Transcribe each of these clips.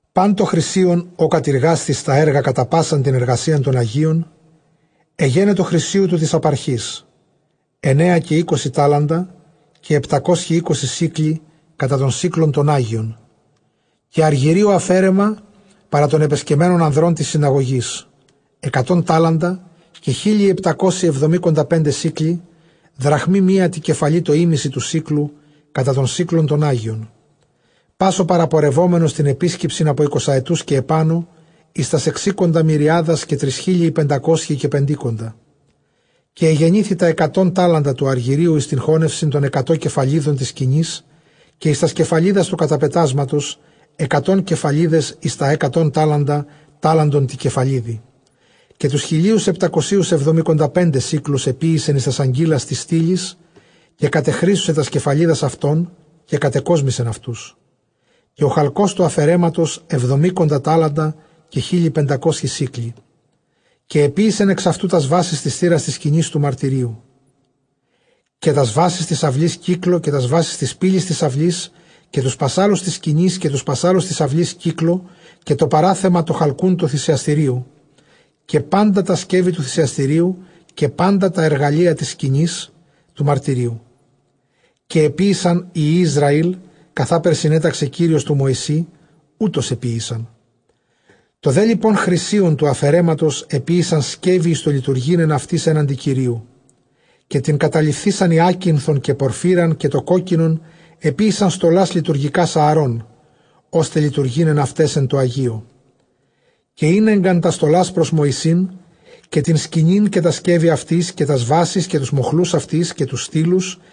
Πᾶν τὸ χρυσίον, ὃ κατειργάσθη εἰς τὰ ἔργα κατὰ πᾶσαν τὴν ἐργασίαν τῶν ἁγίων, ἐγένετο χρυσίου τοῦ τῆς ἀπαρχῆς, ἐννέα καὶ εἴκοσι τάλαντα, καὶ ἑπτακόσιοι εἴκοσι σίκλοι κατὰ τὸν σίκλον τὸν ἅγιον· Καὶ ἀργυρίου ἀφαίρεμα παρὰ τῶν ἐπεσκεμμένων ἀνδρῶν τῆς συναγωγῆς ἑκατὸν τάλαντα, καὶ χίλιοι ἑπτακόσιοι ἑβδομηκονταπέντε σίκλοι· δραχμὴ μία τῇ κεφαλῇ τὸ ἥμισυ τοῦ σίκλου, κατὰ τὸν σίκλον τὸν ἅγιον· Πᾶς ὁ παραπορευόμενος τὴν ἐπίσκεψιν ἀπὸ εἰκοσαετοῦς καὶ ἐπάνω εἰς τὰς ἑξήκοντα μυριάδας, καὶ τρισχίλιοι πεντακόσιοι καὶ πεντήκοντα. Καὶ ἐγενήθη τὰ ἑκατὸν τάλαντα τοῦ ἀργυρίου εἰς τὴν χώνευσιν τῶν ἑκατὸν κεφαλίδων τῆς σκηνῆς, καὶ εἰς τὰς κεφαλίδας τοῦ καταπετάσματος, ἑκατὸν κεφαλίδες εἰς τὰ ἑκατὸν τάλαντα, τάλαντον τῇ κεφαλίδι· Καὶ τοὺς χιλίους ἑπτακοσίους ἑβδομηκοντα πέντε σίκλους ἐποίησεν εἰς τὰς ἀγκύλας τοῖς στύλοις· καὶ κατεχρύσωσε τὰς κεφαλίδας αὐτῶν, καὶ κατεκόσμησεν αὐτούς. Καὶ ὁ χαλκὸς τοῦ ἀφαιρέματος ἑβδομήκοντα τάλαντα, καὶ χίλιοι πεντακόσιοι σίκλοι· Καὶ ἐποίησαν ἐξ αὐτον τὰς βάσεις τῆς θύρας τῆς σκηνῆς τοῦ μαρτυρίου, καὶ τὰς βάσεις τῆς αὐλῆς κύκλῳ, καὶ τὰς βάσεις τῆς πύλης τῆς αὐλῆς, καὶ τοὺς πασσάλους τῆς σκηνῆς, καὶ τοὺς πασσάλους τῆς αὐλῆς κύκλῳ, καὶ τὸ παράθεμα τὸ χαλκοῦν τοῦ θυσιαστηρίου, καὶ πάντα τὰ σκεύη τοῦ θυσιαστηρίου, καὶ πάντα τὰ ἐργαλεῖα τῆς σκηνῆς τοῦ μαρτυρίου· Καὶ ἐποίησαν οἱ υἱοὶ Ἰσραὴλ, καθὰ συνέταξε Κύριος τῷ Μωυσῇ, οὕτως ἐποίησαν· Τὸ δὲ λοιπὸν χρυσίον τοῦ ἀφαιρέματος ἐποίησαν σκεύη εἰς τὸ λειτουργεῖν ἐν αὐτοῖς ἔναντι Κυρίου· Καὶ τὴν καταλειφθεῖσαν ὑάκινθον, καὶ πορφύραν, καὶ τὸ κόκκινον ἐποίησαν στολὰς λειτουργικὰς Ἀαρών, ὥστε λειτουργεῖν ἐν αὐταῖς ἐν τῷ ἁγίῳ· Καὶ ἤνεγκαν τὰς στολὰς πρὸς Μωυσῆν, καὶ τὴν σκηνὴν, καὶ τὰ σκεύη αὐτῆς, τὰς βάσεις καὶ τοὺς μοχλοὺς αὐτῆς, καὶ τοὺς στύλους·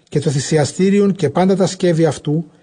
καὶ τὸ θυσιαστήριον, καὶ πάντα τὰ σκεύη αὐτοῦ.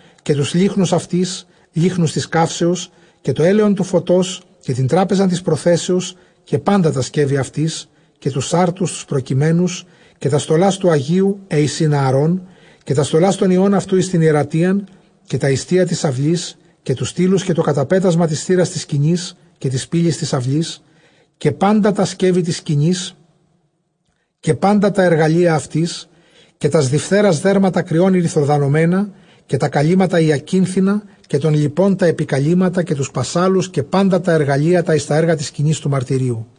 καὶ τοὺς λύχνους αὐτῆς, λύχνους τῆς καύσεως, καὶ τὸ ἔλαιον τοῦ φωτός· Καὶ τὴν τράπεζαν τῆς προθέσεως, καὶ πάντα τὰ σκεύη αὐτῆς· καὶ τοὺς ἄρτους τοὺς προκειμένους· Καὶ τὰς στολὰς τοῦ ἁγίου, αἵ εἰσιν Ἀαρών, καὶ τὰς στολὰς τῶν υἱῶν αὐτοῦ, εἰς τὴν ἱερατείαν· Καὶ τὰ ἱστία τῆς αὐλῆς, καὶ τοὺς στύλους· καὶ τὸ καταπέτασμα τῆς θύρας τῆς σκηνῆς, καὶ τῆς πύλης τῆς αὐλῆς· Καὶ πάντα τὰ σκεύη τῆς σκηνῆς, καὶ πάντα τὰ ἐργαλεῖα αὐτῆς· καὶ τὰς διφθέρας δέρματα κριῶν ἠρυθροδανωμένα, καὶ τὰ καλύμματα ὑακίνθινα, καὶ τῶν λοιπῶν τὰ ἐπικαλύμματα· καὶ τοὺς πασσάλους, καὶ πάντα τὰ ἐργαλεῖα τὰ εἰς τὰ ἔργα τῆς σκηνῆς τοῦ μαρτυρίου·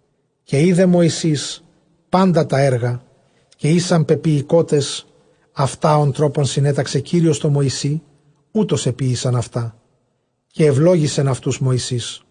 Καὶ εἶδε Μωυσῆς πάντα τὰ ἔργα, καὶ ἦσαν πεποιηκότες αὐτὰ ὃν τρόπον συνέταξε Κύριος τῷ Μωυσῇ, οὕτως ἐποίησαν αὐτὰ, καὶ εὐλόγησεν αὐτοὺς Μωυσῆς.